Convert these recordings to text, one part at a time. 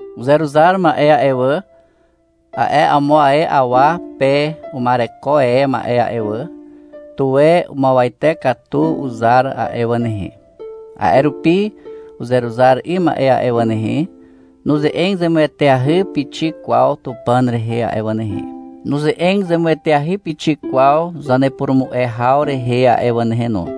Uzeruzar ma'e a'e wà, a'e amo ae awa pe uma'ereko e ma'e a'e wà, tuwe umuawate katu uzar a'e wà nehe. A'e rupi uzeruzar 'ym ma'e a'e wà nehe, nuze'eg zemueteahy pixik kwaw Tupàn rehe a'e wà nehe, nuze'eg zemueteahy pixik kwaw zanepurumu'e haw rehe a'e wà nehe no.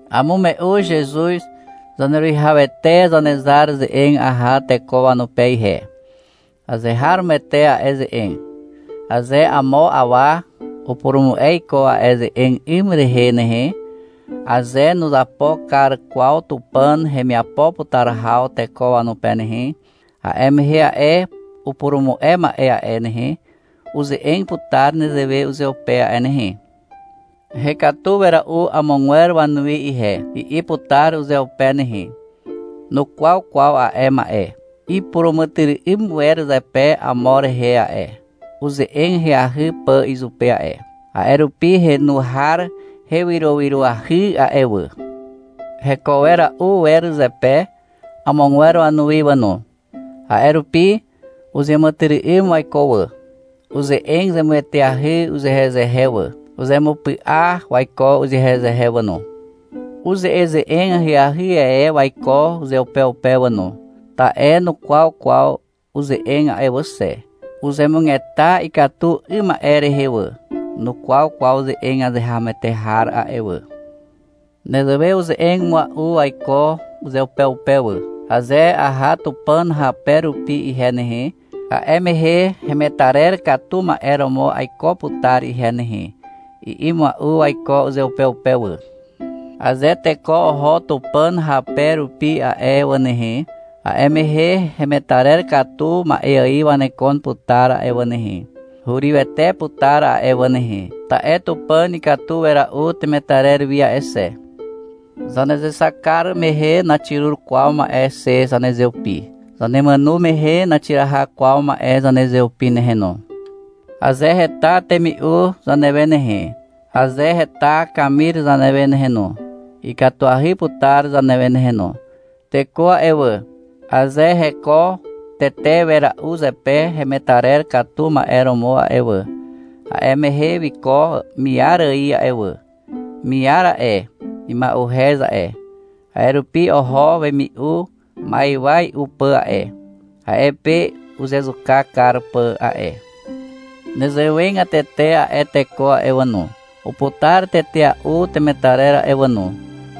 Amume'u Zezuz Zaneruwihawete Zanezar ze'eg aha teko wanupe ihe. Azeharomoete a'e ze'eg. Aze amo awa upurumu'e iko a'e ze'eg 'ym rehe nehe, aze nuzapo kar kwaw Tupàn hemiapo putar haw teko wanupe nehe, a'e mehe a'e upurumu'e ma'e a'e nehe, uze'eg putar nezewe uzeupe a'e nehe. — Hekatu wera'u amogwer wanuwi ihe, i'i putar uzeupe nehe. Nukwaw kwaw ma'e a'e. Ipuràmàtyry'ym wer zepe amo rehe a'e, uze'eg ahyahy pà izupe a'e. A'e rupi henu har hewyrowyroahy a'e wà. Heko wera'u wer zepe amogwer wanuwi wà no. A'e rupi uzeàmàtyry'ym waiko wà. Uze'eg zemueteahy uzehezehe wà. Uzemupy'a waiko uzehezehe wà no. Uze'eze'eg ahyahy e waiko uzeupeupe wà no. Ta'e nukwaw kwaw uze'eg a'e wà xe. Uzemugeta ikatu 'ym ma'e rehe wà. Nukwaw kwaw ze'eg azeharomoete har a'e wà. Nezewe uze'eg mua'u waiko uzeupeupe wà. — Aze aha Tupàn hape rupi ihe nehe, a'e mehe hemetarer katu ma'e romo aiko putar ihe nehe, i'i mua'u waiko uzeupeupe wà. Aze teko oho Tupàn hape rupi a'e wà nehe, a'e mehe hemetarer katu ma'e ài wanekon putar a'e wà nehe. Hurywete putar a'e wà nehe, ta'e Tupàn ikatu wera'u temetarer wi a'e xe. Zanezexak kar mehe naxirur kwaw ma'e xe zanezeupi. Zanemàno mehe, naxiraha kwaw ma'e zanezeupi nehe no. Aze heta temi'u zanewe nehe, aze heta kamir zanewe nehe no, ikatuahy putar zanewe nehe no. Teko a'e wà, aze heko tetea'u wer zepe hemetarer katu ma'e romo a'e wà, a'e mehe wiko miar ài a'e wà. Miar a'e, ima'uhez a'e, a'e rupi oho wemi'u ma'ywa i'u pà a'e, a'e pe uzezuka kar pà a'e. Nezewegatete a'e teko a'e wà no, uputar tetea'u temetarer a'e wà no,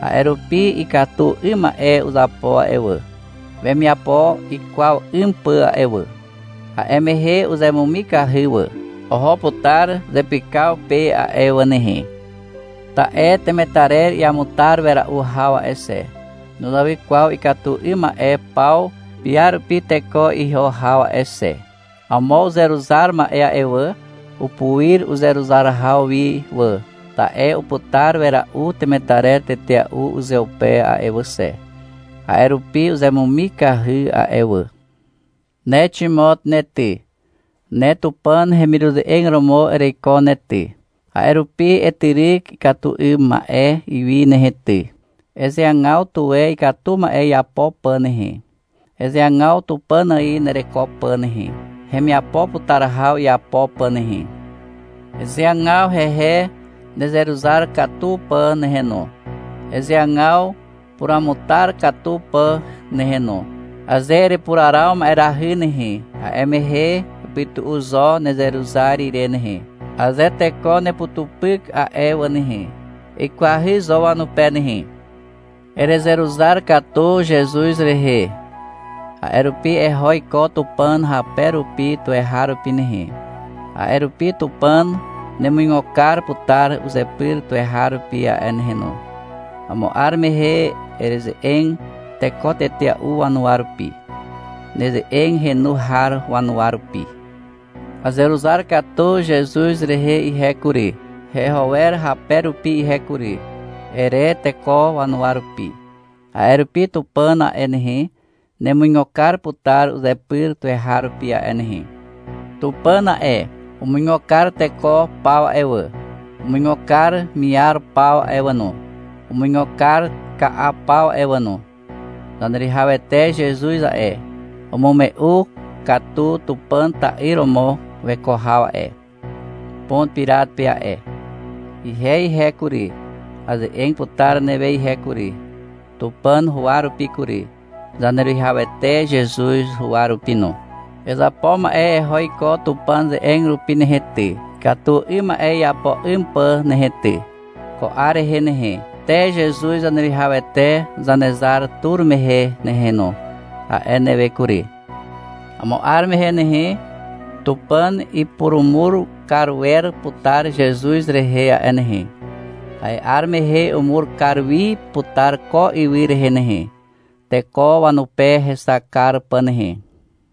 a'e rupi ikatu 'ym ma'e uzapo a'e wà, wemiapo ikwaw 'ym pà a'e wà. A'e mehe uzemumikahy wà. Oho putar zepykaw pe a'e wà nehe. Ta'e temetarer iamutar wera'u haw a'e xe, nuzawy kwaw ikatu 'ym ma'e paw piarupi teko iho haw a'e xe. Amo uzeruzar ma'e a'e wà, upuir uzeruzar haw wi wà, ta'e uputar wera'u temetarer tetea'u uzeupe a'e wà xe. A'e rupi uzemumikahy a'e wà. Ne Ximot ne ty, ne Tupàn hemiruze'eg romo ereiko ne ty. A'e rupi etyryk ikatu 'ym ma'e wi nehe ty. Ezeagaw tuwe ikatu ma'e iapo pà nehe. Ezeagaw Tupàn ài nereko pà nehe, hemiapo putar haw iapo pà nehe. Ezeagaw hehe nezeruzar katu pà nehe no, ezeagaw puruamutar katu pà nehe no. Aze erepuraraw ma'erahy nehe, a'e mehe epytu'u zo nezeruzar ire nehe. Aze teko neputupyk a'e wà nehe, eikwahy zo wanupe nehe. Erezeruzar katu Zezuz rehe, a'e rupi eho iko Tupàn hape rupi tuweharupi nehe. A'e rupi Tupàn nemuigo kar putar uzepyr tuweharupi a'e nehe no. Amo 'ar mehe ereze'eg teko tetea'u wanuwa rupi, neze'eg henu har wanuwa rupi. — Azeruzar katu Zezuz rehe ihe kury, heho wer hape rupi ihe kury, ere teko wanuwa rupi. A'e rupi Tupàn a'e nehe, nemuigo kar putar uzepyr tuweharupi a'e nehe. Tupàn a'e, umuigo kar teko paw a'e wà, umuigo kar miar paw a'e wà no, umuigo kar ka'a paw a'e no. Zaneruwihawete Zezuz a'e, umume'u katu Tupàn ta'yr romo weko haw a'e, Pon Pirat pe a'e. Ihe ihe kury, aze'eg putar newe ihe kury, Tupàn huwa rupi kury, Zaneruwihawete Zezuz huwa rupi no. Ezapo ma'e eho iko Tupàn ze'eg rupi nehe ty, ikatu 'ym ma'e iapo 'ym pà nehe ty, ko 'ar rehe nehe, te Zezuz Zaneruwihawete Zanezar tur mehe nehe no, a'e newe kury. Amo 'ar mehe nehe, Tupàn ipurumur kar wer putar Zezuz rehe a'e nehe. A'e 'ar mehe umur kar wi putar ko ywy rehe nehe, teko wanupe hexak kar pà nehe.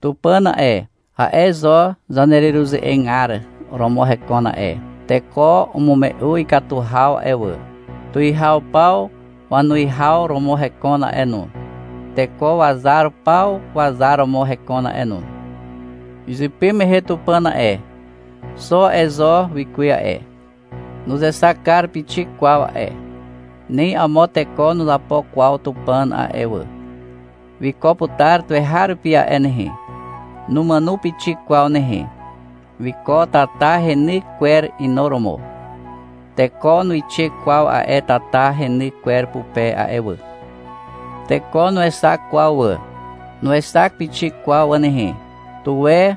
Tupàn a'e, a'e zo zanereruze'egar romo hekon a'e. Teko umume'u ikatu haw a'e wà. Tuwihaw paw wanuwihaw romo hekon a'e no. Teko wazar paw wazar romo hekon a'e no. Izypy mehe Tupàn a'e, xo a'e zo wikuwe a'e. Nuzexak kar pixik kwaw a'e. Ni amo teko nuzapo kwaw Tupàn a'e wà. Wiko putar tuweharupi a'e nehe. Numàno pixik kwaw nehe. Wiko tata heny kwer inuromo. Teko nuixe kwaw a'e tata heny kwer pupe a'e wà. Teko nuexak kwaw wà. Nuexak pixik kwaw wà nehe. Tuwe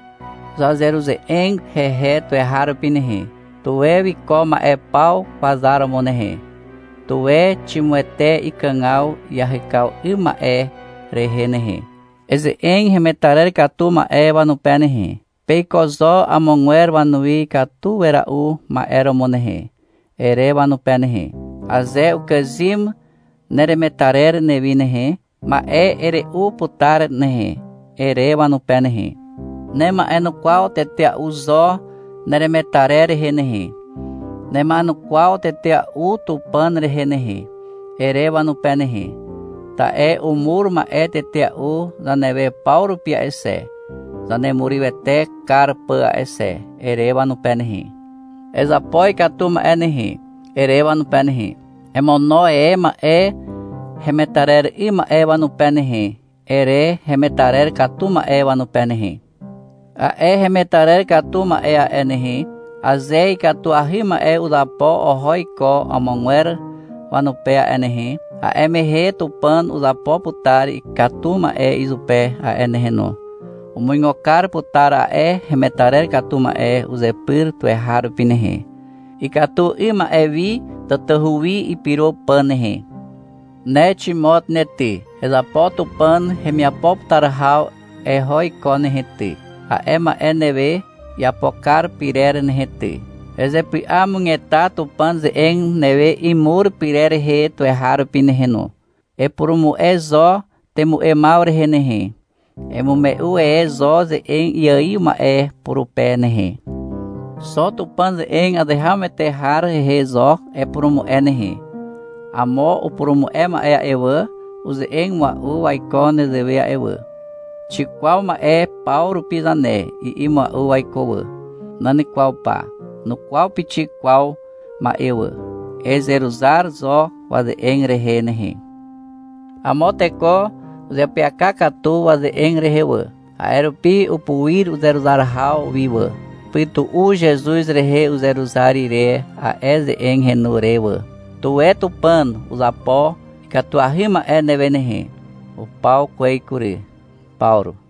zazeruze'eg hehe tuweharupi nehe. Tuwe wiko ma'e paw wazar romo nehe. Tuwe ximuete ikàgaw iahyk 'ym ma'e rehe nehe. Eze'eg hemetarer katu ma'e wanupe nehe. — Peiko zo amogwer wanuwi ikatu wera'u ma'e romo nehe, ere wanupe nehe. — Aze ukàzym neremetarer newi nehe, ma'e ere'u putar nehe, ere wanupe nehe. — Nema'enukwaw tetea'u zo neremetarer rehe nehe. Nema'enukwaw tetea'u Tupàn rehe nehe, ere wanupe nehe. Ta'e umur ma'e tetea'u zanewe paw rupi a'e xe, zanemurywete kar pà a'e xe, ere wanupe nehe. — Ezapo ikatu ma'e nehe, ere wanupe nehe. -Emono e ma'e hemetarer 'ym ma'e wanupe nehe, ere hemetarer katu ma'e wanupe nehe. A'e hemetarer katu ma'e a'e nehe, aze ikatuahy ma'e uzapo oho iko amogwer wanupe a'e nehe, a'e mehe Tupàn uzapo putar ikatu ma'e izupe a'e nehe no. Umuigo kar putar a'e hemetarer katu ma'e uzepyr tuweharupi nehe, ikatu 'ym ma'e wi tatahu wi ipyro pà nehe. Ne Ximot ne ty, ezapo Tupàn hemiapo putar haw eho iko nehe ty, a'e ma'e newe iapo kar pyrer nehe ty. Ezepy'amugeta Tupàn ze'eg newe imur pyrer rehe tuweharupi nehe no. Epurumu'e zo temu'emaw rehe nehe. Emume'u e zo ze'eg iaiw ma'e purupe nehe. Xo Tupàn ze'eg azeharomoete har rehe zo epurumu'e nehe. Amo upurumu'e ma'e a'e wà, uze'eg mua'u waiko nezewe a'e wà, — Xikwaw ma'e paw rupi zane, i'i mua'u waiko wà. Nan kwaw pa. Nukwaw pixik kwaw ma'e wà. Ezeruzar zo waze'eg rehe nehe. Amo teko uzeapyaka katu waze'eg rehe wà. A'e rupi upuir uzeruzar haw wi wà. Upytu'u Zezuz rehe uzeruzar ire a'e ze'eg henu re wà. Tuwe Tupàn uzapo ikatuahy ma'e newe nehe. Upaw kwez kury. Pawru.